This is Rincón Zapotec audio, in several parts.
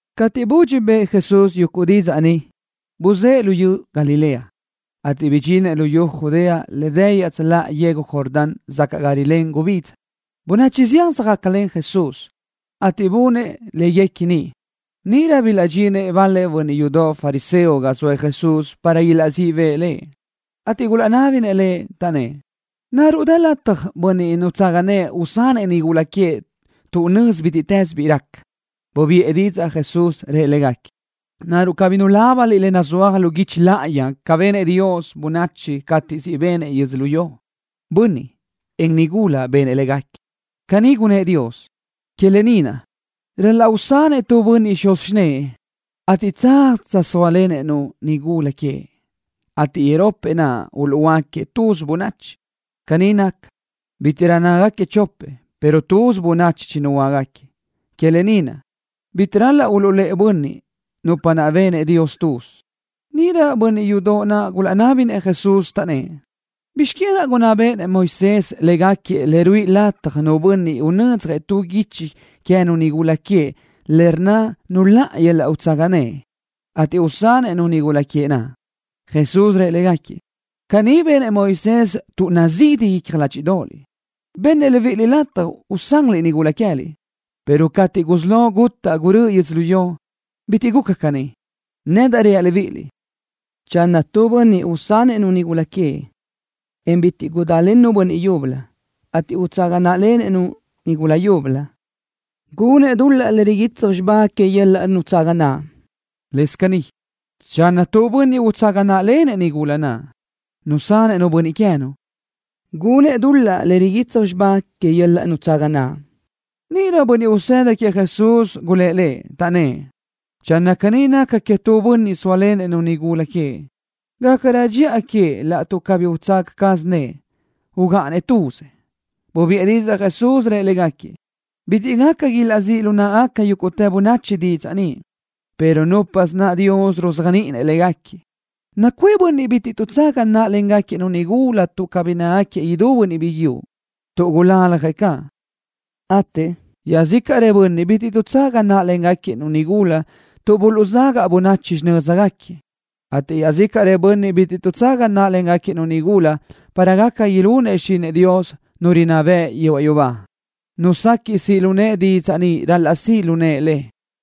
Cateʼ budxi bëʼë Jesús yuguʼ didzaʼ ni, buzë́ʼë luyú Galilea, ateʼ bidxinëʼ luyú Judea le dë iaʼtsöláʼa yegu Jordán sacaʼ ga rilén gubidza. Bönachi zián söjácalen Jesús, ateʼ bunëʼ léguequi niʼ. Níʼirö bilaʼdxinëʼ bal-lëʼ bönniʼ yudoʼ fariseo ga zoëʼ Jesús para ilaʼzíʼ bëʼë Lëʼ, ateʼ gulaʼnábinëʼ Lëʼ, taʼnnë́ʼ: —¿Naruʼ dë lataj bönniʼ nutsaga nëʼë usanëʼ nigula queëʼ tuʼ nözi bítiʼtës bi raca? Bubiʼë didzaʼ Jesús, rëʼ légaquiëʼ: —¿Naruʼ cabí nulábaniliʼ le nazúaj lu guichi láʼayi ca benëʼ Dios bönachi cateʼ siʼ benëʼ yödzölió? Bönniʼ, en nigula benëʼ légaquiëʼ. Caní gunnë́ʼ Dios: “Que lë ni naʼ, ral-laʼ usanëʼ tu bönniʼ xuz xinë́ʼë, ateʼ tsaz tsöjsóalenëʼ-nu nigula queëʼ, ateʼ iropëʼ naʼ uluʼhuöáquiëʼ tuz bönachi.” Caní naca, bítiʼrö nácagaquiëʼ chopëʼ pero tuz bönachi chinuhuöáquiëʼ. Que lë ni naʼ, bitiʼ ral-laʼ uluʼlë́ʼë bönniʼ nupa naʼ benëʼ Dios tuz. Níʼirö bönniʼ yudoʼ naʼ gulaʼnábinëʼ Jesús, taʼnnë́ʼ: —¿Bizx que naʼ gunná béʼenëʼ Moisés légaquiëʼ le ruíʼi lataj nu bönniʼ unödzjëʼ tu guichi queë́nu nigula queëʼ le rnna nuláʼa yöl-laʼ nutsaga naʼ, ateʼ usanëʼ-nu nigula queëʼ naʼ? Jesús rëʼ légaquiëʼ: —Caní benëʼ Moisés tuʼ nazidi icja ládxiʼdoʼoliʼ. Bennëʼ libíʼiliʼ lataj usanliʼ-nu nigula queë́liʼ, pero cateʼ gusí lo gutaʼ gurö́ʼö yödzölió, bitiʼ guca caní. Nedaʼ reaʼ libíʼiliʼ, channö tu bönniʼ usanëʼ-nu nigula queëʼ, en bitiʼ gudálennu bönniʼ yúbölö, ateʼ utsaga náʼalenëʼ-nu nigula yúbölö, gunëʼ dul-laʼ le riguitsaj xibá que yöl-laʼ nutsaga naʼ. Lëscaʼ caní, channö nu bönniʼ utsaga náʼalenëʼ-nu nigula naʼ, nusanëʼ-nu bönniʼ queë́nu, gunëʼ dul-laʼ le riguitsaj xibá que yöl-laʼ nutsaga naʼ. Níʼirö yuguʼ bönniʼ usëda queëʼ Jesús gulë́ʼ Lëʼ, taʼnnë́ʼ: —Channö caní naca queëʼ tu bönniʼ zóalenëʼ-nu nigula queëʼ, gácarö dxiʼa queëʼ laʼtuʼ cabí utsaga caz nëʼë, ugáʼanëʼ tuzëʼ. Bubiʼë didzaʼ Jesús, rëʼ légaquiëʼ: —Bitiʼ gaca ilaʼzíʼ lu náʼagaca yúguʼtë bönachi didzaʼ ni, pero núpasö naʼ Dios ruzéajniʼinëʼ léguequi. Nacuʼë bönniʼ bitiʼ tuʼtsaga náʼalengaquiëʼ nigula tuʼ cabí nácagaquiëʼ idú bönniʼ biguiúʼ, tuʼ gulaljëʼ caʼ, ateʼ iaʼzícaʼrëʼ bönniʼ bitiʼ tuʼtsaga náʼalengaquiëʼ nigula tuʼ buluʼzagaʼ bönachi xinö́zgaquiëʼ, ateʼ iaʼzícaʼrëʼ bönniʼ bitiʼ tuʼtsaga náʼalengaquiëʼ nigula para gaca ilunëʼ xichinëʼ Dios, Nu rinná bëʼ yehuaʼ yubá. Nu sequiʼ siʼ lu nëʼe didzaʼ ni ral-laʼ siʼ lu nëʼe le.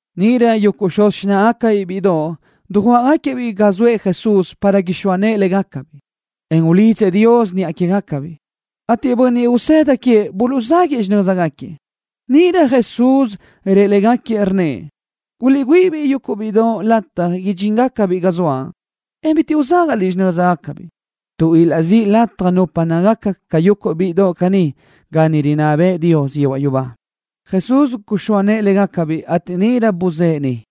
Níʼirö yuguʼ xuz xináʼagacabiʼ bíʼidoʼ dujuáʼagaquiëʼ-biʼ ga zoëʼ Jesús para ixóa nëʼë légacabiʼ, en ulidzëʼ Dios niʼa quégacabiʼ, ateʼ bönniʼ usëda queëʼ buluʼzáguiʼë xinö́zgaquiëʼ. Níʼirö Jesús rëʼ légaquiëʼ, rnnëʼ: —Guliʼgüíʼi-biʼ yuguʼ bíʼidoʼ lataj ilaʼdxinbiʼ ga zoaʼ, en bitiʼ uzágaʼliʼ xinö́zgacabiʼ, tuʼ ilaʼzíʼ lataj nupa nácagaca ca yuguʼ bíʼidoʼ caní ga niʼ rinná bëʼë Dios yehuaʼ yubá. Jesús guxóa nëʼë légacabiʼ, ateʼ níʼirö buzë́ʼë niʼ.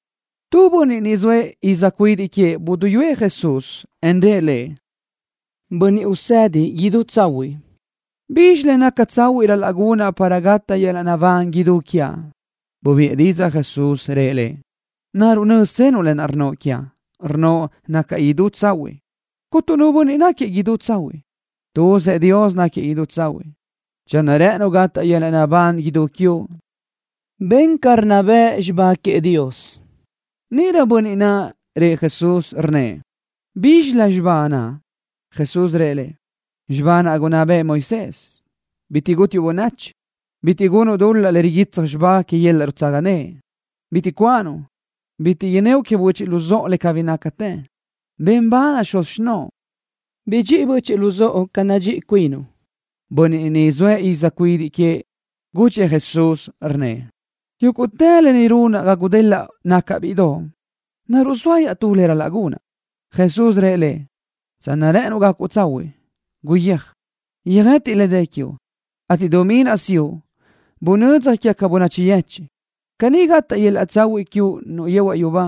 Tu bönniʼ ni zoëʼ iz cuidiʼ queëʼ buduyúëʼ Jesús, en rëʼ Lëʼ: —Bönniʼ Usedi idú tsahuiʼ. ¿Bizxi le naca tsahuiʼ ral-laʼ gunaʼ para gataʼ yöl-laʼ naʼbán idú quiaʼ? Bubiʼë didzaʼ Jesús, rëʼ lëʼ: —¿Naruʼ nö́ztsenuʼ lë naʼ rnnoʼ quiaʼ, rnnoʼ nacaʼ idú tsahuiʼ? Cuntu nu bönniʼ náquiëʼ idú tsahuiʼ. Tuzëʼ Dios náquiëʼ idú tsahuiʼ. Channö rë́ʼënuʼ gataʼ yöl-laʼ naʼbán idú quiuʼ, ben ca rinná bëʼ xibá queëʼ Dios. Níʼirö bönniʼ naʼ rëʼ Jesús, rnnëʼ: —¿Bízxilö xibá naʼ? Jesús rëʼ lëʼ: —Xibá naʼ gunná bëʼë Moisés: Bitiʼ gútiuʼ bönachi. Bitiʼ gunuʼ dul-laʼ le riguitsaj xibá que yöl-laʼ nutsaga naʼ. Bitiʼ cuanuʼ. Bitiʼ inníoʼ que böchiʼ luzóʼo le cabí nácate. Ben bal xuz xinóʼo. Bidxíʼi böchiʼ luzóʼo ca nadxíʼi cuinuʼ. Bönniʼ naʼ ni zoëʼ iz cuidiʼ queëʼ gudxëʼ Jesús, rnnëʼ: —Yúguʼtë lë ni runaʼ ga gudelaʼ nacaʼ bíʼidoʼ. ¿Naruʼ zoa iaʼtú le ral-laʼ gunaʼ? Jesús rëʼ lëʼ: —Channö rë́ʼënuʼ gacuʼ tsahuiʼ, guyéaj, yöjëtiʼ le dë quiuʼ, ateʼ dumí naʼ siʼu, bunödzaj quégaca bönachi yechiʼ. Caní gataʼ yöl-laʼ tsahuiʼ quiuʼ niʼ yehuaʼ yubá.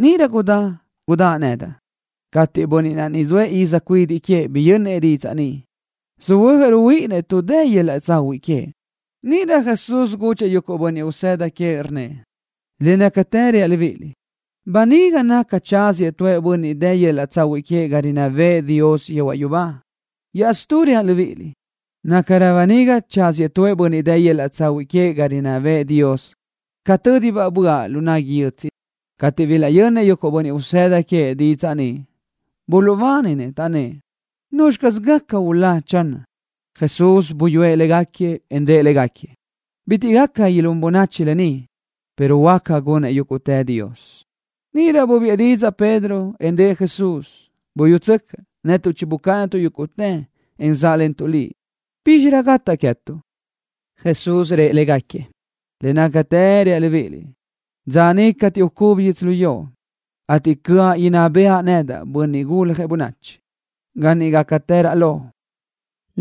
Níʼirö gudá, gudáʼ nedaʼ. Cateʼ bönniʼ naʼ ni zoëʼ iz cuidiʼ queëʼ biyönnëʼ didzaʼ ni, söhuö́jëʼ ruhuíʼinnëʼ tuʼ dëdaʼ yöl-laʼ tsahuiʼ queëʼ. Níʼirö Jesús gudxëʼ yuguʼ bönniʼ usëda queëʼ, rnnëʼ: —Le nácatë reaʼ libíʼiliʼ, böniga naca tsáziëʼ nu bönniʼ dë yöl-laʼ tsahuiʼ queëʼ ga rinná bëʼë Dios yehuaʼ yubá. Iaʼstú reaʼ libíʼiliʼ, nácarö böniga tsáziëʼ tu bönniʼ dë yöl-laʼ tsahuiʼ queëʼ ga niʼ rinná bëʼë Dios ca tö́dibaʼ böaʼ lu nagui yötsiʼ. Cateʼ bilaʼyönnëʼ yuguʼ bönniʼ usëda queëʼ didzaʼ ni, buluʼbáninë, taʼnnë́ʼ: —¿Nuzxi caz gaca ulá, channö? Jesús buyúëʼ légaquiëʼ, en rëʼ légaquiëʼ: —Bitiʼ gaca ilún bönachi lë ni, pero Dios huáca gunëʼ yúguʼtë. Níʼirö bubiʼë didzaʼ Pedro, en rëʼ Jesús: —Buyútsöcaʼ, netuʼ chibucáʼanatuʼ yúguʼtë, en záʼlentuʼ Liʼ. ¿Bízxirö gataʼ queë́tuʼ? Jesús rëʼ légaquiëʼ: —Le nácatë reaʼ libíʼiliʼ, dza niʼ cateʼ ucubi yödzölió, ateʼ cöʼa inná bëʼa nedaʼ, Bönniʼ Guljëʼ Bönachi, ga niʼ gácatëraʼ lo,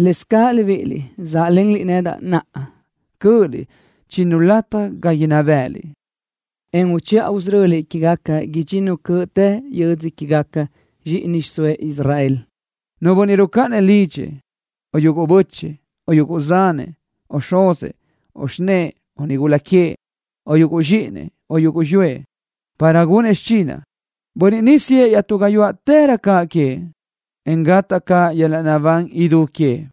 lëscaʼ libíʼiliʼ záʼlenliʼ nedaʼ naʼa, cö́ʼöliʼ chinnu lataj ga inná bë́ʼëliʼ, en uchiʼa usöröliʼ quégaca idxinnu cöʼtë yödzö quégaca zxíʼini xiʼsóëʼ Israel. Nu bönniʼ rucáʼanëʼ lidxëʼ, o yuguʼ bö́chëʼë, o yuguʼ zanëʼ, o xuzëʼ, o xinë́ʼë, o nigula queëʼ, o yuguʼ zxíʼinëʼ, o yuguʼ xiyúëʼ, para gunëʼ xichinaʼ, bönniʼ ni siʼë iaʼtú gáyuaʼtërö caʼ queëʼ, en gataʼ caʼ yöl-laʼ naʼbán idú queëʼ.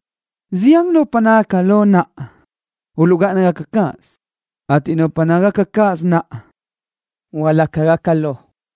Zián nupa nácagaca lo naʼa, uluʼgáʼana cáʼasö, ateʼ nupa nagáʼanagaca cáʼasö naʼa, hualácagaca lo.